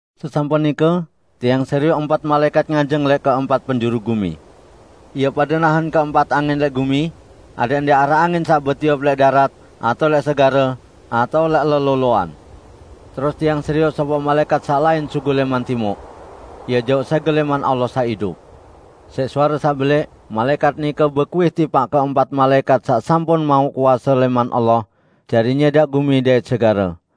Sesampun nike, tiang serioq empat malaẽkat nganjeng lẽq keempat penjuru gumi. Ie pade nahen keempat angin lẽq gumi adẽq ndẽq araq angin saq betiup lẽq darat atao lẽq segare, atao lẽq leloloan. Terus tiang serioq sopoq malaẽkat saq lain sugul lẽman timuq. Ie jauq sẽgel lẽman Allah saq idup. Siq suare saq belẽq malaẽkat nike bekuih tipaq keempat malaẽkat saq sampun mauq kuase lẽman Allah jari nyẽdaq gumi dait segare.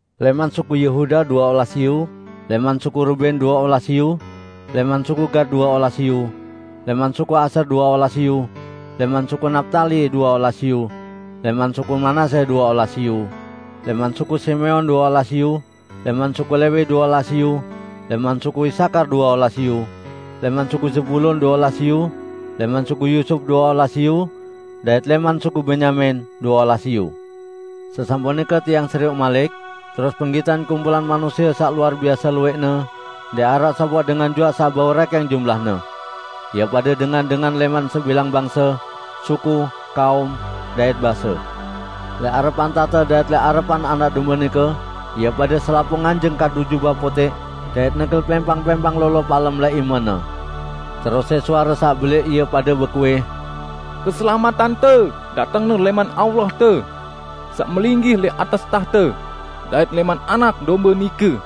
Lẽman suku Yehuda due olas iyu, lẽman suku Ruben due olas iyu, lẽman suku Gat due olas iyu, lẽman suku Asyer due olas iyu, lẽman suku Naptali due olas iyu, lẽman suku Manasye due olas iyu, lẽman suku Simeon due olas iyu, lẽman suku Lewi due olas iyu, lẽman suku Isakar due olas iyu, lẽman suku Zebulon due olas iyu, lẽman suku Yusup due olas iyu, dait lẽman suku Benyamin due olas iyu. Sesampun nike tiang serioq malik, terus penggitan kumpulan manusie saq luar biase luwẽqne -- ndẽq araq sopoq dengan juaq saq bau rẽkẽng jumlahne. Ie pade dengan-dengan lẽman sebilang bangse, suku, kaum, dait base. Lẽq arepan tahte dait lẽq arepan Anak Dombe nike ie pade selapuq nganjeng kadu jubah putẽq dait negel pẽmpang-pẽmpang lolo palem lẽq imene. Terus siq suare saq belẽq ie pade bekuih, "Keselametante datengne lẽman Allahte, saq melinggih lẽq atas tahte, dait lẽman Anak Dombe nike!"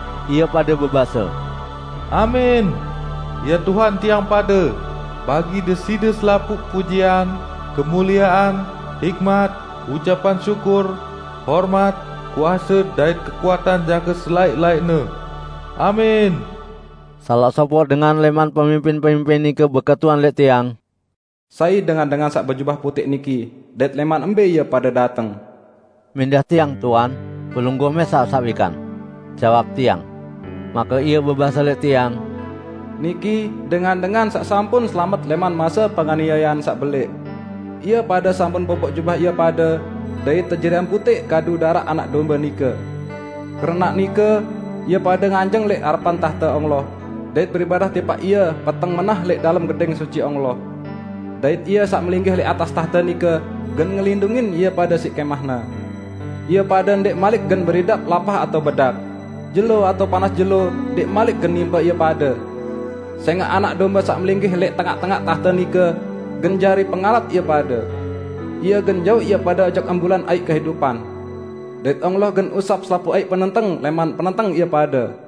Ie pade bebase, "Amin! Ya Tuhan tiang pade, bagi Deside selapuq pujian, kemuliean, hikmat, ucapan syukur, hormat, kuase, dait kekuatan jangke selaẽq-laẽqne! Amin!" Salaq sopoq dengan lẽman pemimpin-pemimpin nike beketuan lẽq tiang, "Sai dengan-dengan saq bejubah putẽq niki dait lẽman mbẽ ie pade dateng?" "Mindah tiang, tuan. Pelungguh mẽsaq saq wikan," jawab tiang. Make ie bebase lẽq tiang, "Niki dengan-dengan saq sampun selamet lẽman mase penganiayean saq belẽq. Ie pade sampun popoq jubah ie pade dait tejariang putẽq kadu daraq Anak Dombe nike. Keranaq nike ie pade nganjeng lẽq arepan tahte Allah, dait beribadah tipaq Ie peteng menah lẽq dalem Gedẽng Suci Allah. Dait Ie saq melinggih lẽq atas tahte nike gen ngelindungin ie pade siq kẽmah-Ne. Ie pade ndẽq malik gen beridap lapah, atao bedak; jelo atao panas jelo ndẽq malik gen nimpe ie pade, sẽngaq Anak Dombe saq melinggih lẽq tengaq-tengaq tahte nike gen jari pengarat ie pade. Ie gen jauq ie pade ojok embulan aiq kehidupan. Dait Allah gen usap selapuq aiq penenteng lẽman penenteng ie pade."